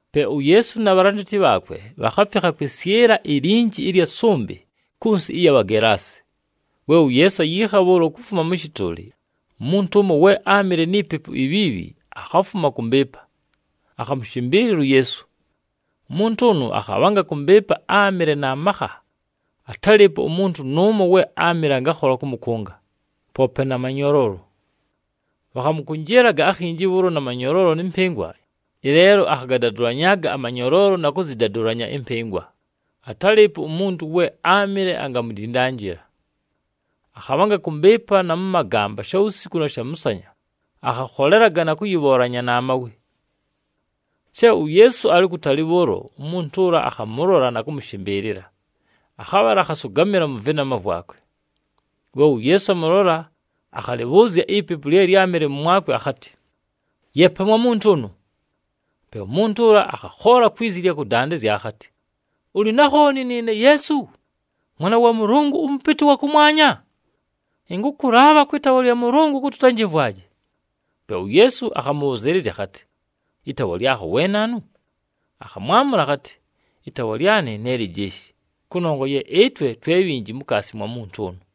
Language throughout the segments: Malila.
Pe uYeesu na bhalandati bhaakwe bhakhafikha kwɨsyɨla ilinji ɨlya sʉmbɨ, kʉ nsɨ ɨya Bhagelaasi. We uYeesu ayiikha bhʉʉlo kufuma mʉ shɨtʉʉlɨ, umuntu ʉmo we áamɨle ni pepu ibhiibhi, akhafuma kʉ mbɨɨpa, akhamʉshɨmbɨɨlɨla uYeesu. Umuntu ʉnʉ akhabhanga kʉ mbɨɨpa, áamɨle na makha, atálɨɨpo umuntu nʉʉmo we áamɨle angakhola kʉmʉkʉnga poope na manyoloolo. Bhakhamʉkʉnjɨɨlaga akhinji bhʉʉlo na manyoloolo nɨ mpɨngwa, ɨleelo akhagadadʉlanyaaga amanyoloolo na kʉzɨdadʉlanya ɨmpɨngwa, atálɨɨpo umuntu we áamɨle angamudindanjila. Akhabhanga kʉ mbɨɨpa na mʉ magamba shawusiku na shamʉsanya, akhakholelaga na kʉyɨbhoolanya na mawe. She uYeesu alɨ ukutali bhʉʉlo, umuntu ʉla akhamʉlola na kʉmʉshɨmbɨɨlɨla, akhabhala akhasʉgamɨla mʉ vɨnama vwakwe. We uYeesu amʉlola, akhalɨbhʉʉzya ipepu lye lyámɨle mʉmwakwe akhatɨ, “Yeepa mwa muntu ʉnʉ!” Pe umuntu ʉla akhakhoola kwi zi ɨlya kʉdandɨzya akhatɨ, “Ʉlɨ na khooni nɨɨne Yeesu, Mwana wa Mʉlʉngʉ ʉMʉpɨtɨ ʉwa kʉmwanya? Ɨnkʉkʉlaabha kwɨ taawa lya Mʉlʉngʉ kʉtɨ ʉtanjɨmvwaje.” Pe uYeesu akhamʉbhʉzɨɨlɨzya akhatɨ, “Ɨtaawa lyakho we naanu?” Akhamwamʉla akhatɨ, “Ɨtaawa lyanɨ ne Lijeeshi, kʉnongwa ye ɨtwe twe bhinji mukaasi mwa muntu ʉnʉ.”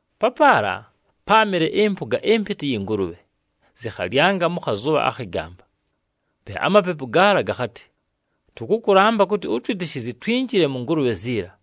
Papaala páamɨle ɨmpʉga ɨmpɨtɨ ɨyɨ ngʉlʉbhe, zɨkhalyanga mʉ khazʉbha akhɨ gamba. Pe amapepu gaala gakhatɨ, “Tʉkʉkʉlamba kʉtɨ ʉtwɨtɨshɨzye, twinjile mʉ ngʉlʉbhe ziila.”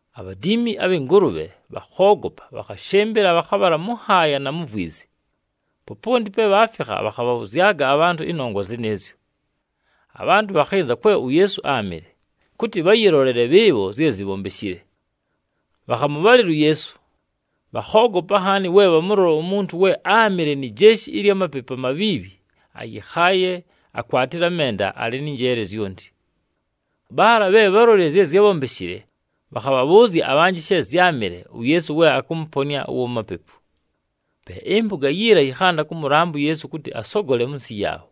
Abhadiimi abhɨ ngʉlʉbhe, bhakhoogopa, bhakhashɨmbɨla, bhakhabhala mʉ nhaaya na mu vwizi. Poponti pe bhaafikha, bhakhabhabhʉzyaga abhantʉ ɨnongwa zɨnɨɨzyo. Abhantʉ bhakhɨnza kwe uYeesu áamɨle, kʉtɨ bhayɨlolele bhɨɨbho zye zibhombeshile. Bhakhamʉbhalɨla uYeesu, bhakhoogopa nhaani we bhamʉlola umuntu we áamɨle ni jeeshi ɨlya mapepu amabhiibhi ayɨkhaaye, akwatile amenda, alɨ nɨ njeele zyonti. Bhaala bhe bhálolile zye zyábhombeshile, bhakhabhabhʉʉzya abhanjɨ she zyámɨle, uYeesu we akʉmʉponɨa ʉwa mapepu. Pe ɨmpʉga yiila yɨkhanda kʉmʉlamba uYeesu kʉtɨ asogole mʉ nsɨ yaabho.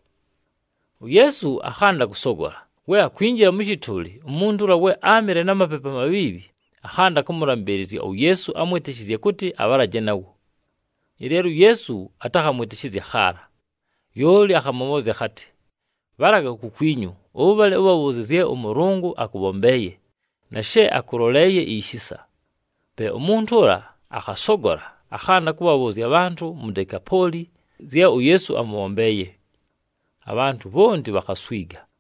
UYeesu akhanda kʉsogola, we akwinjila mʉ shɨtʉʉlɨ, umuntu ʉla we áamɨle na mapepu amabhiibhi akhanda kʉmʉlambɨɨlɨzya uYeesu amwɨtɨshɨzye kʉtɨ abhalaje nawo. Ɨleelo uYeesu atakhamwɨtɨshɨzya khaala, lyoli akhamʉbhʉʉzya akhatɨ, “Bhalaga kukwinyu, ʉbhale ʉbhabhʉʉzye zye ʉMʉlʉngʉ akʉbhombeeye, na she akʉloleeye ishisa.” Pe umuntu ʉla akhasogola, akhanda kʉbhabhʉʉzya abhantʉ mu Dekapooli zye uYeesu amʉbhombeeye. Abhantʉ bhonti bhakhaswiga.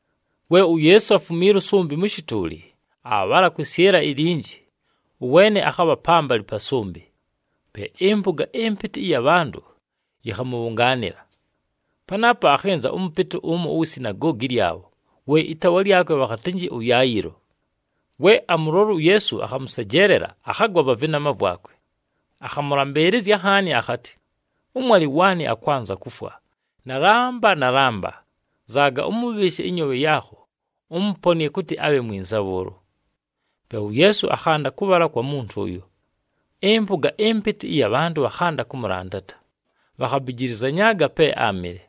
We uYeesu afumiila ʉsʉmbɨ mʉ shɨtʉʉlɨ, aabhala kwɨsyɨla ilinji, ʉweene akhabha pambalɨ pa sʉmbɨ, pe ɨmpʉga ɨmpɨtɨ ɨya bhantʉ yɨkhamʉbhʉngaanɨla. Panaapo, akhɨnza ʉmʉpɨtɨ ʉmo uwi sinagoogi lyabho, we ɨtaawa lyakwe bhakhatɨnjɨ ʉYayɨlo. We amʉlola uYeesu, akhamʉsejeelela, akhagwa pa vɨnama vwakwe. Akhamʉlambɨɨlɨzya nhaani akhatɨ, “Ʉmwalɨ waanɨ akwanza kufwa. Nalamba nalamba, nzaaga, ʉmʉbhɨɨshe ɨnyoobhe yaakho, ʉmʉponɨe kʉtɨ abhe mwinza bhʉʉlo.” Pe uYeesu akhanda kʉbhala kwa muntu ʉyo. Ɨmpʉga ɨmpɨtɨ ɨya bhantʉ bhakhanda kʉmʉlandata, bhakhabijilizanyaaga pe áamɨle.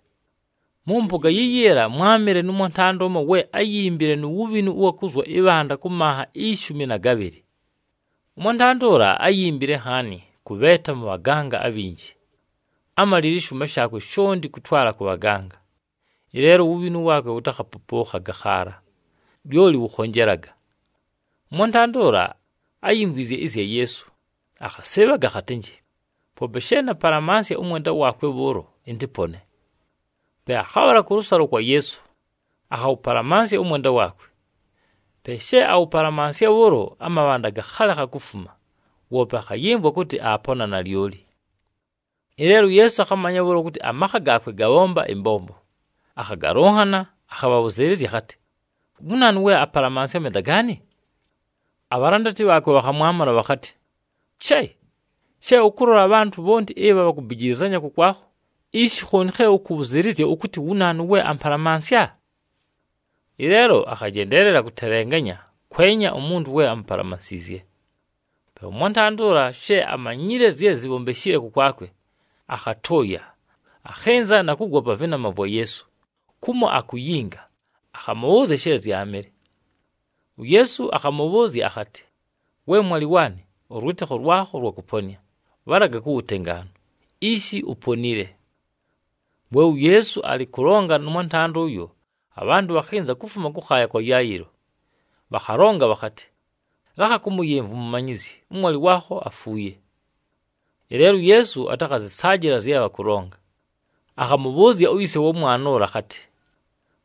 Mʉ mpʉga yiyiila mwámɨle nʉ mwantanda we áyimbile nu wubhinu ʉwa kuzwa ɨbhanda kʉ manha ishumi na gabhɨlɨ. Ʉmwantanda ʉla áyimbile nhaani kʉbheeta mʉ bhaganga abhinji, ámalile ɨshʉʉma shaakwe shonti kʉtwala kʉ bhaganga, ɨleelo uwubhinu waakwe wʉtakhapʉpʉʉkhaga khaala, lyoli wʉkhonjelaga. Ʉmwantanda ʉla áyimvwizye ɨzya Yeesu, akhasɨɨbhaga akhatɨnjɨ, “Poope she napalamansya ʉmwenda waakwe bhʉʉlo, ɨntɨpone.” Pe akhabhala kʉlʉsalo kwa Yeesu, akhawʉpalamansya ʉmwenda waakwe. Pe she awʉpalamansya bhʉʉlo, amabhanda gakhalekha kufuma, woope akhayɨmvwa kʉtɨ aapona nalyoli. Ɨleelo uYeesu akhamanya bhʉʉlo kʉtɨ amakha gaakwe gabhomba ɨmbombo. Akhagalʉnhana, akhabhʉzɨɨlɨzya akhatɨ, “Wu naanu we apalamansya amenda gaanɨ?” Abhalandati bhaakwe bhakhamwamʉla bhakhatɨ, “Che! She ʉkʉlola abhantʉ bhonti ɨbha bhakubijilizanya kʉkwakho, ishi khooni khe ʉkʉbhʉzɨɨlɨzya ʉkʉtɨ, ‘Wu naanu we ampalamansya?’” Ɨleelo akhajendeelela kʉtelenganya kwenya umuntu we amupalamansiizye. Pe ʉmwantanda ʉla, she amanyile zye zibhombeshile kʉkwakwe, akhatʉʉya, akhɨnza na kugwa pa vɨnama vwa Yeesu, kumo akuyinga. Akhamʉbhʉʉzya she zyaamɨle. UYeesu akhamʉbhʉʉzya akhatɨ, “We mwalɨ waanɨ, ʉlwɨtɨkho lwakho lwakʉponɨa, bhalaga ku wutengaanu, ishi uponile.” We uYeesu alɨ kʉlonga nʉ mwantanda ʉyo, abhantʉ bhakhɨnza kufuma kʉkhaaya kwa Yayɨlo, bhakhalonga bhakhatɨ, “Lakha kʉmʉyɨmvwa umumanyizyi, ʉmwalɨ waakho afuuye.” Ɨleelo uYeesu atakhazɨsaajɨla zye bhakʉlonga, akhamʉbhʉʉzya uyise wa mwana ʉla akhatɨ,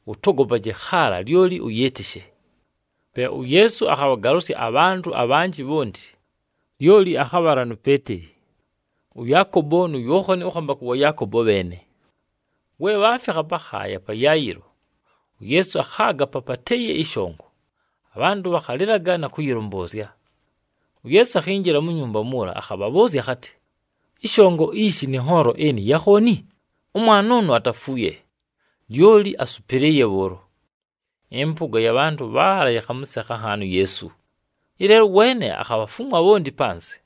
“Ʉtogopaje khaala, lyoli ʉyɨɨtɨshe.” Pe uYeesu akhabhagalʉsya abhantʉ abhanjɨ bhonti, lyoli akhabhala nu Peeteli, ʉYaakobo nu Yookhani ʉkhambakʉ wa Yaakobo bheene. We bhaafikha pakhaaya pa Yayɨlo, uYeesu akhaaga papatɨɨye ɨshongo, abhantʉ bhakhalɨlaga na kʉyɨlʉmbʉʉzya. UYeesu akhinjila mu nyumba muula, akhabhabhʉʉzya akhatɨ, “Ɨshongo ishi nɨ nhoolo ɨnɨ ya khooni? Ʉmwana ʉnʉ atafuuye, lyoli asʉpɨlɨɨye bhʉʉlo.” Ɨmpʉga ɨya bhantʉ bhaala yɨkhamʉsekha nhaani uYeesu, ɨleelo ʉweene akhabhafumwa bhonti panzɨ.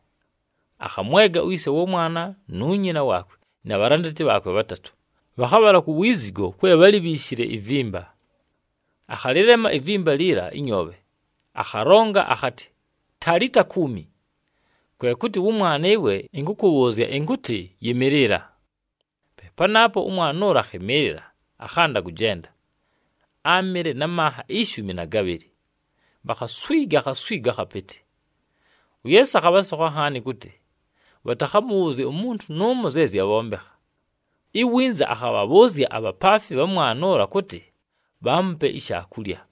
Akhamwega uyise wa mwana nu nyina waakwe na bhalandati bhaakwe bhatatʉ, bhakhabhala ku wizigo kwe bhálibhiishile ivimba. Akhalɨlema ivimba liila ɨnyoobhe, akhalonga akhatɨ, “Talita, kumi!” Kwe kʉtɨ, “Wʉmwana ɨwe, ɨnkʉkʉbhʉʉzya ɨnkʉtɨ yɨmɨɨlɨla!” Pe panaapo, ʉmwana ʉla akhɨmɨɨlɨla, akhanda kʉjenda, áamɨle na manha ishumi na gabhɨlɨ, bhakhaswiga akhaswigo akhapɨtɨ. UYeesu akhabhasokha nhaani kʉtɨ, bhatakhamʉbhʉʉzye umuntu nʉʉmo zye zyabhombekha. Iwinza akhabhabhʉʉzya abhapaafi bha mwana ʉla kʉtɨ bhaamupe ishaakulya.